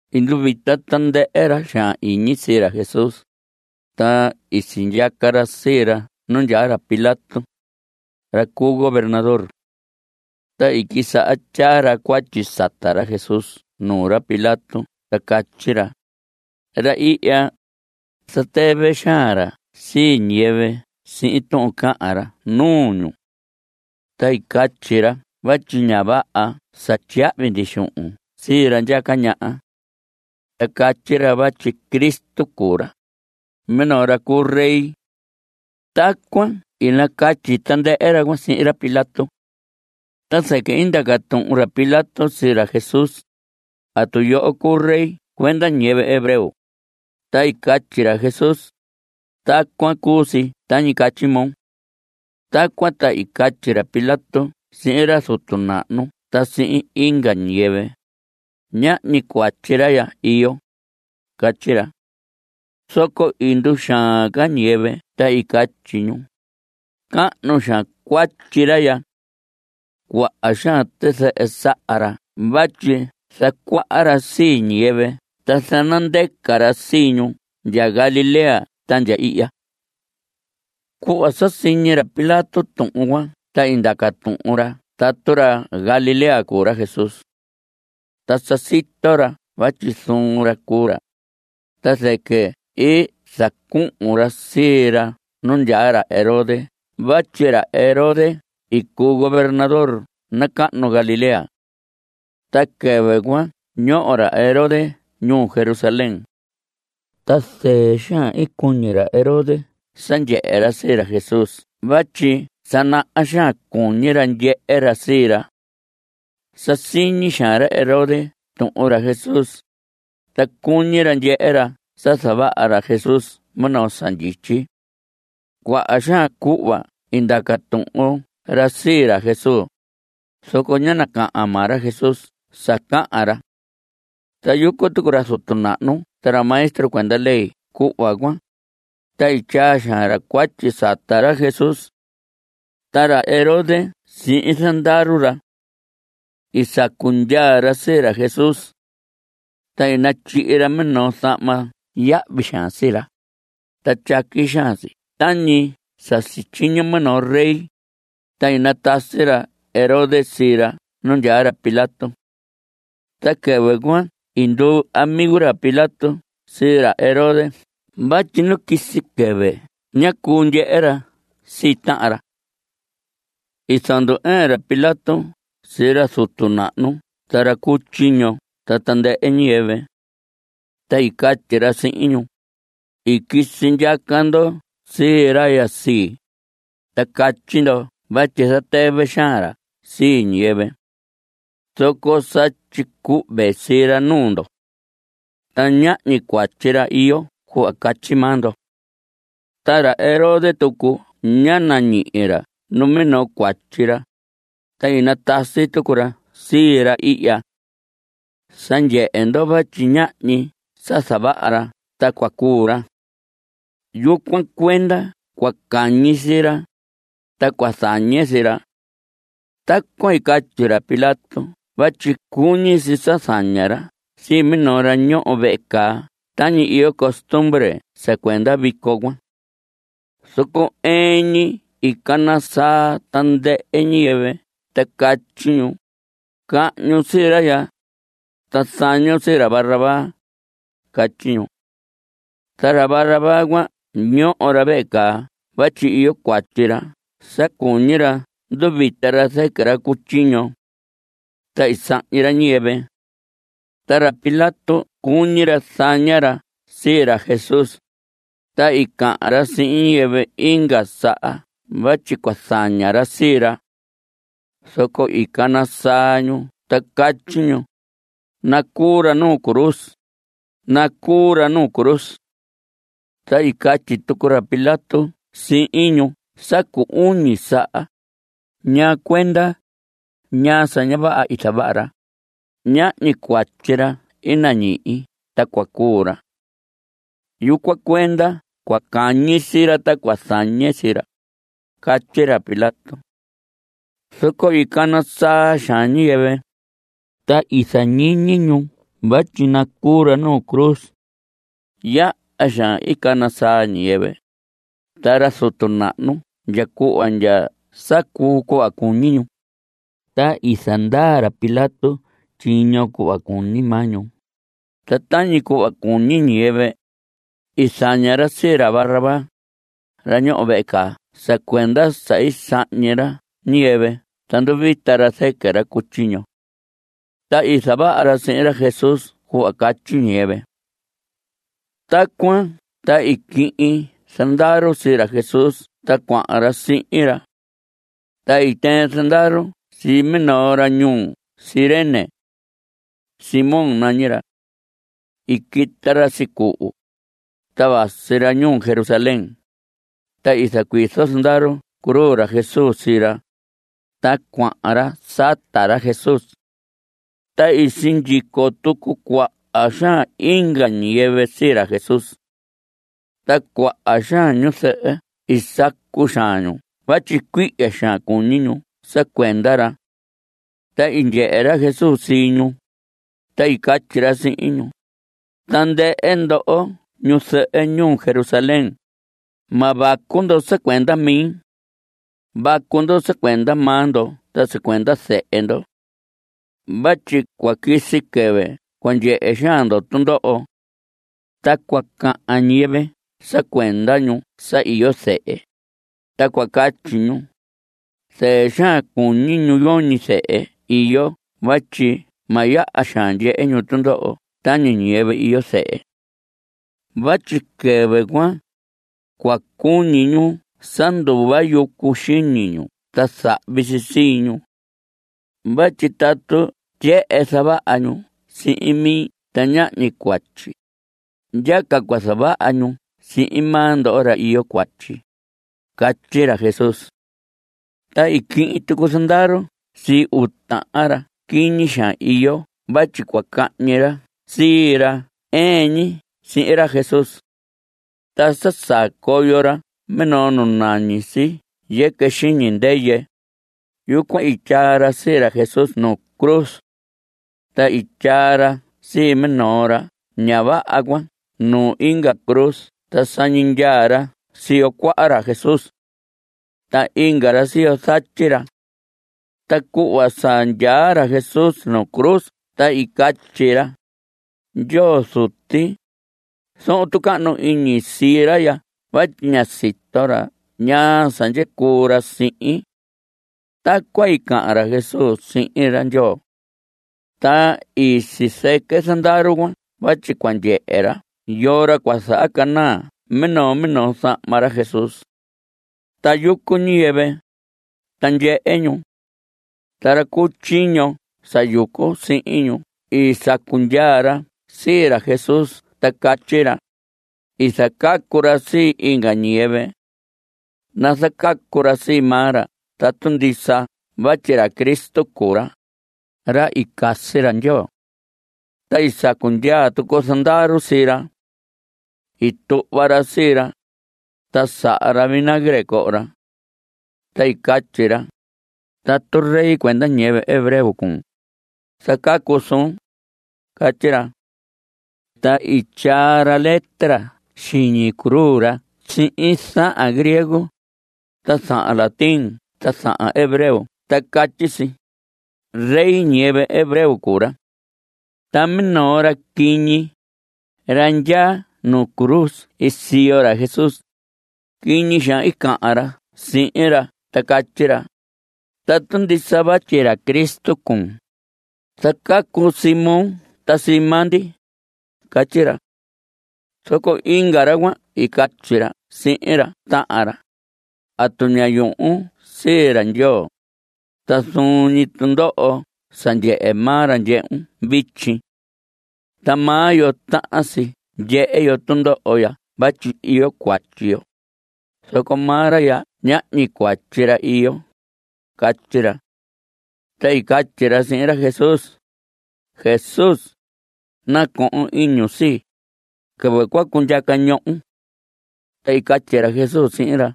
I nduvita tandɨhɨ ra xaan iñi sii ra Jesús, ta i sindyaca ra sii ra nu ndyaa ra Pilato, ra cu governador. Ta i quisaha tyaa ra cuatyi sata ra Jesús nuu ra Pilato ta catyi ra: Ra ihya, zatɨvɨ xaan ra sii ñiyɨvɨ sihin tuhun cahan ra nuu ñu. Ta catyi ra vatyi ña vaha sa tyiyahvi ndi xuhun sii ra ndyaca ñaha. Ta catyi ra vatyi Cristo cuu ra, minoo ra cu rey. Tacuan i nacatyi tandɨhɨ ra cuan sihin ra Pilato. Ta zɨquɨ i ndaca tuhun ra Pilato sii ra Jesús: ¿Atu yoho cuu rey cuenda ñiyɨvɨ hebreo? Ta i catyi ra Jesús: Tacuan cu si tañi catyi moo. Tacuan ta i catyi ra Pilato sihin ra zutu nahnu ta sihin inga ñiyɨvɨ: Ñahñi cuatyi ra ya iyo. Catyi ra. Zoco i nduxaan ca ñiyɨvɨ ta i catyi ñu: Cahnu xaan cuatyi ra ya. Cuaha xaan tizɨhɨ saha ra vatyi zacuaha ra sii ñiyɨvɨ ta zanandɨquɨ ra sii ñu ndya Galilea ta ndya ihya. Cuhva sa siñi ra Pilato tuhun cuan ta i ndaca tuhun ra tatu ra Galilea cuu ra Jesús. Ta sa sito ra vatyi zuun ra cuu ra, ta zɨquɨ i zacuhun ra sii ra nu ndyaa ra Herodes vatyi ra Herodes i cuu gobernador nacahnu Galilea. Ta quɨvɨ cuan ñoho ra Herodes ñuu Jerusalén. Ta zɨɨ xaan i cuñi ra Herodes sa ndyehe ra sii ra Jesús vatyi sa naha xaan cuñi ra ndyehe ra sii ra. Sa siñi xaan ra Herodes tuhun ra Jesús, ta cuñi ra ndyehe ra sa zavaha ra Jesús minoo sa ndyityi. Cuaha xaan cuhva i ndaca tuhun ra sii ra Jesús, zoco ñá nacahan maa ra Jesús sa cahan ra. Ta yucu tucu ra zutu nahnu ta ra maestro cuenda ley cuhva cuan, ta i tyaa xaan ra cuatyi sata ra Jesús. Ta ra Herodes sihin zandaru ra, i sacu ndyaa ra sii ra Jesús. Ta i natyihi ra minoo zahma yahvi xaan sii ra, ta tyaqui xaan si tañi sa sityiño minoo rey, ta i natasi ra Herodes sii ra nu ndyaa ra Pilato. Ta quɨvɨ cuan i nduu amigo ra Pilato sii ra Herodes vatyi nu quisi quɨvɨ ñá cuu ndyehe ra sii tahan ra. I zandu‑ɨɨn ra Pilato sii ra zutu nahnu ta ra cu tyiño ta tandɨhɨ ñiyɨvɨ. Ta i catyi ra sihin ñu: I quisi ndyaca ndo sii ra ya sii, ta catyi ndo vatyi zatɨvɨ xaan ra sii ñiyɨvɨ. Zoco sa tyicuhve sii ra nuu ndo. Ta ñahñi cuatyi ra iyo cuhva catyi maa ndo. Ta ra Herodes tucu ñá nañihi ra numinoo cuatyi ra, ta i natasi tucu ra sii ra ihya. Sa ndyehe ndo vatyi ñahñi sa zavaha ra ta cua cuu ra. Yucuan cuenda cua cañi sii ra, ta cua zañe sii ra. Tacuan i catyi ra Pilato vatyi cuñi si sa zaña ra sii minoo ra ñoho vehe caa tañi iyo costumbre sa cuenda vico cuan. Zoco ɨɨn ñi i cana saa tandɨhɨ ñiyɨvɨ ta catyi ñu: Cahñun sii ra ya, ta zañon sii ra Barrabás. Catyi ñu. Ta ra Barrabás cuan ñoho ra vehe caa vatyi iyo cuatyi ra sa cuñi ra nduvita ra zɨquɨ ra cu tyiño. Ta i sahñi ra ñiyɨvɨ. Ta ra Pilato cuñi ra zaña ra sii ra Jesús, ta i cahan ra sihin ñiyɨvɨ inga saha vatyi cua zaña ra sii ra. Zoco i cana saa ñu ta catyi ñu: Nacuu ra nu cruz. Nacuu ra nu cruz. Ta i catyi tucu ra Pilato sihin ñu sa cu uñi saha: ¿Ñaa cuenda? ¿Ñaa sa ña vaha i zavaha ra? Ñahñi cuatyi ra i nañihi ta cua cuu ra. Yucuan cuenda cua cañi sii ra, ta cua zañe sii ra. Catyi ra Pilato. Zoco i cana saa xaan ñiyɨvɨ, ta i zañiñi ñu vatyi nacuu ra nu cruz. Yaha xaan i cana saa ñiyɨvɨ, ta ra zutu nahnu ndya cuhva ndya sa cuu cuhva cuñi ñu. Ta i zandaa ra Pilato tyiño cuhva cuñi maa ñu. Ta tañi cuhva cuñi ñiyɨvɨ, i zaña ra sii ra Barrabás, ra ñoho vehe caa sa cuenda sa sahñi ra ñiyɨvɨ ta nduvita ra zɨquɨ ra cu tyiño. Ta i zavaha ra sihin ra Jesús cuhva catyi ñiyɨvɨ. Tacuan ta i quihin zandaru sii ra Jesús ta cuahan ra sihin ra. Ta i tɨɨn zandaru sii minoo ra ñuu Cirene. Simón nañi ra. I quita ra sicuhu, ta vasi ra ñuu Jerusalén. Ta i zacuizo zandaru cruz ra Jesús sii ra, ta cuahan ra sata ra Jesús. Ta i sindyico tucu cuaha xaan inga ñiyɨvɨ sii ra Jesús. Ta cuaha xaan ñu zɨhɨ i sacu xaan ñu vatyi cuihya xaan cuñi ñu sa cuenda ra. Ta i ndyehe ra Jesús sii ñu, ta i catyi ra sihin ñu: Tandɨhɨ ndoho ñu zɨhɨ ñuu Jerusalén, ma vacu ndo sa cuenda mi. Vacu ndo sa cuenda maa ndo ta sa cuenda zehe ndo. Vatyi cua quisi quɨvɨ cua ndyehe xaan ndo tundoho. Ta cua cahan ñiyɨvɨ sa cuenda ñu sa yoñi zehe, ta cua catyi ñu: “Zɨɨ xaan cuñi ñu yoñi zehe iyo vatyi ma yaha xaan ndyehe ñu tundoho tañi ñiyɨvɨ iyo zehe.” Vatyi quɨvɨ cuan, cua cuñi ñu sa nduva yucu xiñi ñu ta zahvi si sii ñu. Vatyi tatu tyehen zavaha ñu sihin mi ta ñahñi cuatyi, yaha ca cua zavaha ñu sihin maa ndo ra iyo cuatyi. Catyi ra Jesús. Ta i quihin tucu zandaru sii uu tahan ra quiñi xaan iyo vatyi cua cahñi ra sii ra ɨɨn ñi sihin ra Jesús. Ta sa saa coyo ra minoo nu nañi si Yɨquɨ Xiñi Ndɨyɨ, yucuan i tyaa ra sii ra Jesús nuu cruz. Ta i tyaa ra sii minoo ra ña vaha cuan nuu inga cruz ta sañi ndyaa ra siyo cuaha ra Jesús. Ta inga ra siyo zatyi ra. Ta cuhva sa ndyaa ra Jesús nu cruz ta i catyi ra: Ndyoo Zuti, zohon tucahnu iñi sii ra ya vatyi ña sito ra ñaa sa ndyicuu ra sihin. Tacuan i cahan ra Jesús sihin ra Ndyoo. Ta i sizɨquɨ zandaru cuan vatyi cua ndyehe ra yoo ra cua zahacanaa minoo minoo zahma ra Jesús. Ta yucu ñiyɨvɨ, ta ndyehe ñu. Ta ra cu tyiño sa yucu sihin ñu i sacu ndyaa ra sii ra Jesús ta catyi ra: I zacacu ra sii inga ñiyɨvɨ. Nazacacu ra sii maa ra tatu ndisa vatyi ra Cristo cuu ra, ra i casi ra Ndyoo. Ta i sacu ndyaa tucu zandaru sii ra. I tuhva ra sii ra, ta saha ra vinagre coho ra. Ta i catyi ra: Tatu rey cuenda ñiyɨvɨ hebreo cuun, zacacun suun. Catyi ra. Ta i tyaa ra letra xiñi cruz ra sihin zahan griego, ta zahan latín ta zahan hebreo ta catyi si: “Rey ñiyɨvɨ hebreo cuu ra.” Ta minoo ra quiñi, ra ndyaa nu cruz ii siyo ra Jesús, quiñi xaan i cahan ra sihin ra ta i catyi ra: Tatu ndisa vatyi ra Cristo cuun, zacacun sii moo ta sii maa ndi. Catyi ra. Zoco inga ra cuan i catyi ra sihin ra tahan ra: ¿Atu ña yuhun sii ra Ndyoo? Ta zuun ñi tundoho sa ndyehe maa ra, ndyehun vityi. Ta maa yo tahan si ndyehe yo tundoho ya vatyi iyo cuatyi yo, zoco maa ra ya ñahñi cuatyi ra iyo. Catyi ra. Ta i catyi ra sihin ra Jesús: Jesús, nacohon iñun sii, quɨvɨ cua cundyaca ñohon. Ta i catyi ra Jesús sihin ra: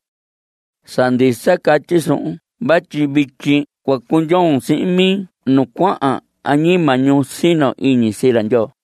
Sa ndisa catyi suhun vatyi vityi cua cundyoon sihin mi nu cuahan añima ñu sino iñi sii ra Ndyoo.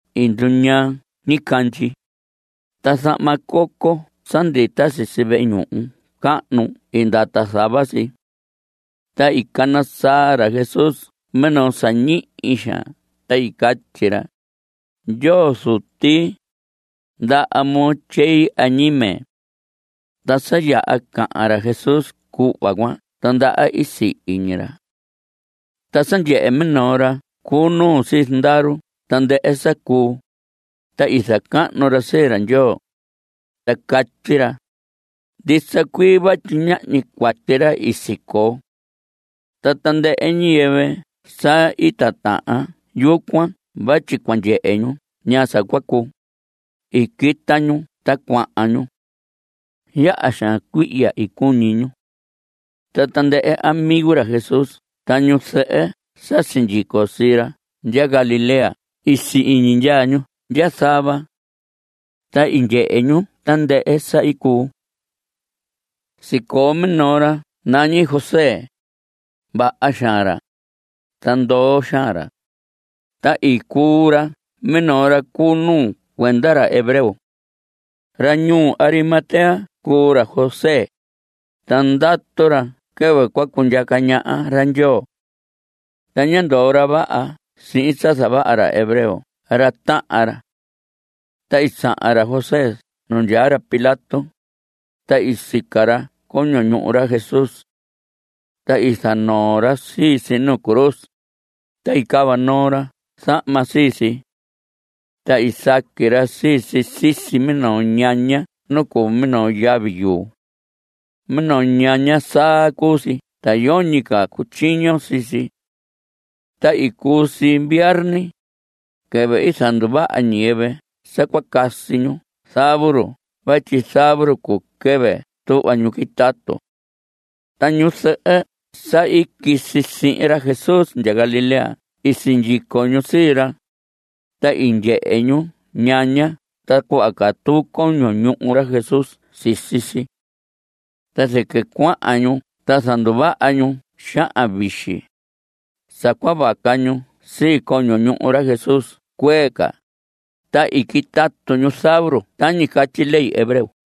I nduñaa ñicandyi. Ta zahma coco sa ndita sisi vehe ñuhu cahnu i ndata zava si. Ta i cana saa ra Jesús minoo sa ñihi xaan ta i catyi ra: Ndyoo Zuti, ndaha moo tyei añime. Ta sa yaha cahan ra Jesús cuhva cuan ta ndaha i sihi ñi ra. Ta sa ndyehe minoo ra cu nuu sii zandaru tandɨhɨ sa cuu, ta i zacahnu ra sii ra Ndyoo, ta catyi ra: Ndisa cuii vatyi ñahñi cuatyi ra i sicoo. Ta tandɨhɨ ñiyɨvɨ sa i titahan yucuan vatyi cua ndyehe ñu ñaa sa cua cuu, i quita ñu ta cuahan ñu. Yaha xaan cuihya i cuñi ñu. Ta tandɨhɨ amigo ra Jesús ta ñu zɨhɨ sa sindyico sii ra ndya Galilea i si‑iñi ndyaa ñu ndya zava. Ta i ndyehe ñu tandɨhɨ sa i cuu. Sicoo minoo ra nañi José. Vaha xaan ra, ta ndoo xaan ra. Ta i cuu ra minoo ra cu nuu cuenda ra hebreo. Ra ñuu Arimatea cuu ra José, ta ndatu ra quɨvɨ cua cundyaca ñaha ra Ndyoo. Ta ñá ndoo ra vaha sihin sa zavaha ra hebreo ra tahan ra. Ta i sahan ra José nu ndyaa ra Pilato, ta i sica ra coño ñuhu ra Jesús. Ta i zanoo ra sii si nuu cruz. Ta i cava noo ra zahma sii si. Ta i saqui ra sii si sisi minoo ñaña nu cuu minoo yavi yuu. Minoo ñaña saa cuu si ta yoñi ca cutyiño sii si. Ta i cuu si viarni, quɨvɨ i zanduvaha ñiyɨvɨ sa cua casi ñu zavuru vatyi zavuru cuu quɨvɨ tuhva ñu quitatu. Ta ñu zɨhɨ sa i quisi sihin ra Jesús ndya Galilea i sindyico ñu sii ra, ta i ndyehe ñu ñaña ta cuhva catuu coño ñuhu ra Jesús sisi si. Ta zɨquɨ cuahan ñu ta zanduvaha ñu xahan vixi (sa cua vaca ñu sii coño ñuhu ra Jesús cuee ca), ta i quitatu ñu zavuru tañi catyi ley hebreo.